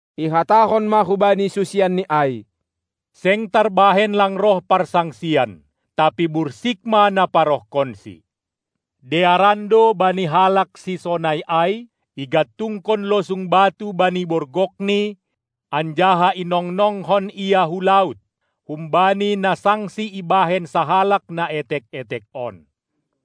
Ihatahon ma hubani susianNi ai: Seng tarbahen lang roh parsangsian, tapi bursik ma na parohkonsi. Dearan do bani halak sisonai ai, igantungkon losung batu bani borgokni anjaha inongnongkon ia hu laut, humbani na sangsi ibahen sahalak na etek-etek on.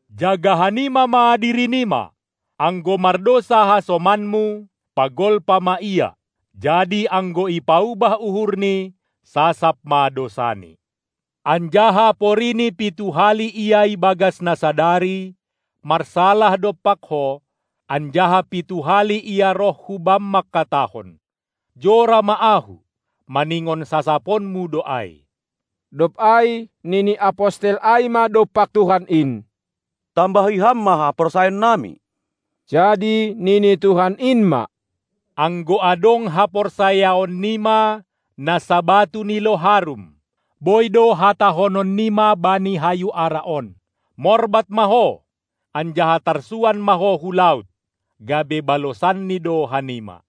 Jaga hanima ma diri nima! Anggo mardousa hasomanmu, pagolpa ma ia, jadi anggo ipaubah uhurni, sasap ma dousani. Anjaha porini pitu hali ia ibagas na sadari marsalah dompak ho, anjaha pitu hali ia roh hubam mangkatahon: "Jora ma ahu", maningon sasaponmu do ai. Dob ai nini apostel ai ma dompak Tuhan in: Tambahi Ham ma haporsayaonnami! Jadi nini Tuhan in ma: Anggo adong haporsayaon nima na sabatu ni loharum, boi do hatahonon nima bani hayu ara on: Morbat ma ho, anjaha tarsuan ma ho hu laut! gabe balosanni do hanima.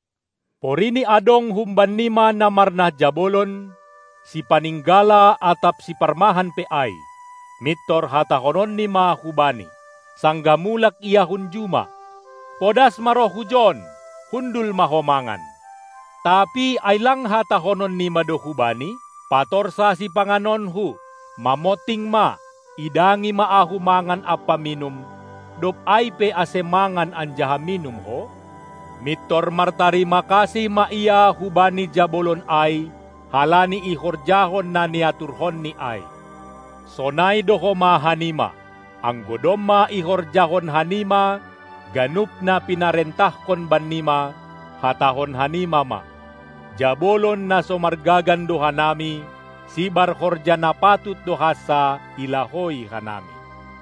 Porini adong humban nima na marnah jabolon, sipaninggala atap siparmahan pe ai, mintor hatahononni ma hubani, sanggah mulak ia hun juma: Podas ma roh hujon, hundul ma ho mangan! Tapi ai lang hatahonon nima do hubani: Patorsa sipanganonku, mamonting ma, idangi ma ahu mangan ampa minum, dob ai pe ase mangan anjaha minum ho! Mintor martarima kasih ma ia hubani jabolon ai, halani ihorjahon na niaturhoni ai! Sonai do homa hanima: Anggo domma ihorjahon hanima ganup na pinarentahkon bannima, hatahon hanima ma: Jabolon na so margagan do hanami, sibar horja na patut do hansa ilahoi hanami.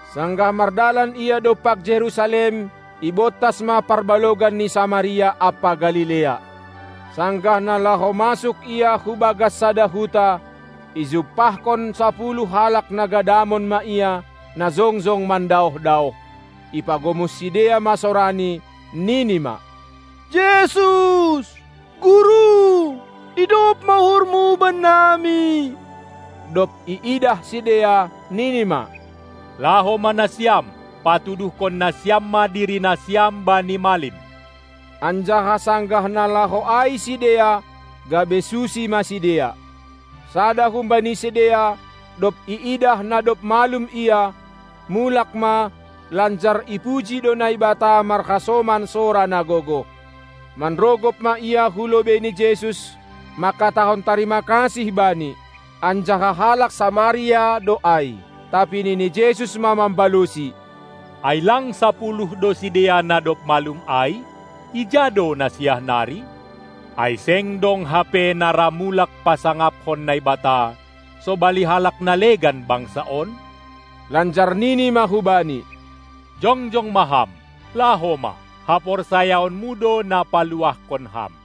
Sanggah mardalan Ia dompak Jerusalem, ibontas ma parbalogan ni Samaria ampa Galilea. Sanggah na laho masuk Ia hubagas sada huta, ijumpahkon sapuluh halak na gadamon ma Ia, na jongjong mandaoh-daoh. Ipagomos sidea ma sorani, nini ma: Jesus, Guru, idop ma uhurmu bannami! Dob iidah sidea, nini ma: Laho ma nasiam, patuduhkon nasiam ma dirinasiam bani malim! Anjaha sanggah na laho ai sidea, gabe susi ma sidea. Sada humbani sidea, dob iidah na dob malum ia, mulak ma, lanjar ipuji do Naibata marhasoman sora na gogoh. Manrogop ma ia hu lobei ni Jesus, mangkatahon tarima kasih Bani. Anjaha halak Samaria do ai. Tapi nini Jesus ma mambalosi: Ai lang sapuluh do sidea na dob malum ai? Ija do na siah nari? Ai seng dong hape na ra mulak pasangaphon Naibata, sobali halak na legan bangsa on? Lanjar Nini ma hubani: Jongjong ma ham, laho ma! Haporsayaonmu do na paluahkon ham!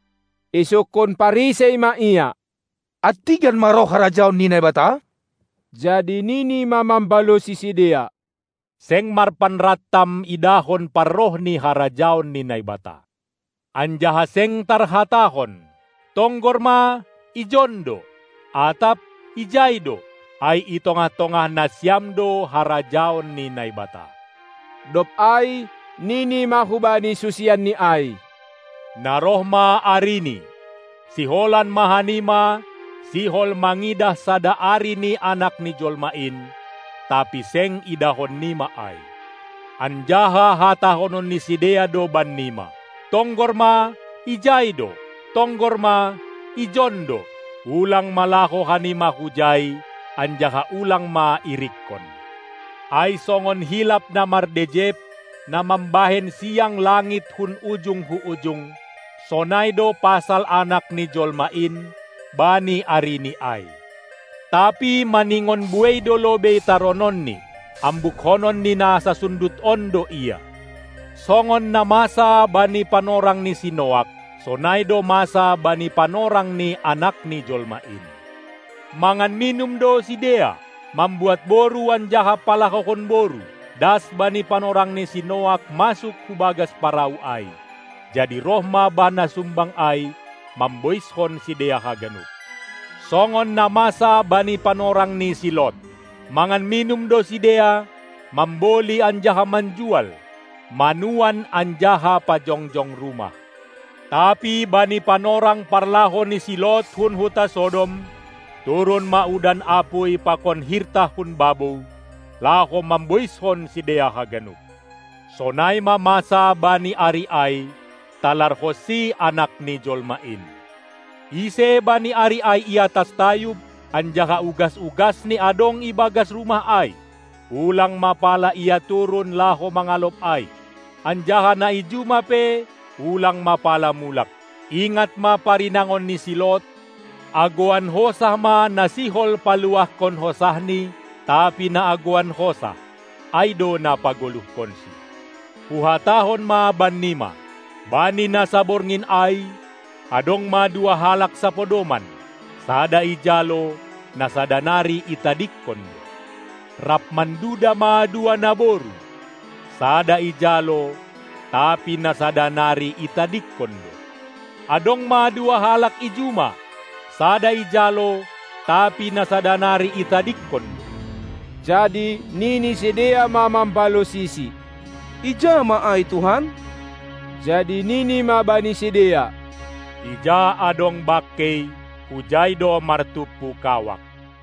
Isungkun Parisei ma Ia: Antigan ma roh harajaon ni Naibata? Jadi nini ma mambalosi sidea: Seng marpanrantam idahon parroh ni harajaon ni Naibata. Anjaha seng tarhatahon: Tonggor ma "ijon do!" atap: "ijai do!" Ai i tongah-tongah nasiam do harajaon ni Naibata. Dob ai nini ma hubani susianNi ai: Na roh ma arini, siholan ma hanima sihol mangidah sada ari ni Anak ni jolma in, tapi seng idahon nima ai. Anjaha hatahonon ni sidea do bannima: Tonggor ma, ijai do! Tonggor ma, ijon do! Ulang ma laho hanima hujai anjaha ulang ma irikkon! Ai songon hilap na mardejep, na mambahen siang langit hun ujung hu ujung, sonai do pasal Anak ni jolma in bani arini ai. Tapi maningon buei do lobei tarononni; ambukkonon ni na sasundut on do Ia. Songon na masa bani panorang ni si Noak, sonai do masa bani panorang ni Anak ni jolma in. Mangan minum do sidea, mambuat boru anjaha palahohon boru, das bani panorang ni si Noak masuk hubagas parau ai; jadi roh ma bah na sumbang ai mamboiskon sidea haganup. Songon na masa bani panorang ni si Lot: Mangan minum do sidea, mamboli anjaha manjual, manuan anjaha pajongjong rumah. Tapi bani panorang parlaho ni si Lot hun huta Sodom, turun ma udan apuy pakon hirtah hun babou, laho mamboishon sidea haganup. Sonai ma masa bani ari ai, talarhonsi Anak ni jolma in. Ise bani ari ai iatas tayub, anjaha ugas-ugasni adong ibagas rumah ai, ulang ma pala ia turun laho mangalop ai; anjaha na i juma pe ulang ma pala mulak. Ingat ma parinangon ni si Lot, Agoan hosah ma na sihol paluahkon hosahni, tapi na agoan hosah, ai do na pagoluhkonsi. Huhatahon ma bannima: Bani na saborngin ai adong ma dua halak sapodoman, sada ijalo, na sada nari itadingkon do. Rap manduda ma dua naboru, sada ijalo, tapi na sada nari itadingkon do. Adong ma dua halak i juma, sada ijalo, tapi na sada nari itadingkon do. Jadi nini sidea ma mambalosiSi: Ija ma ai Tuhan? Jadi Nini ma bani sidea: Ija adong bangkei, hujai do martumpu kawak.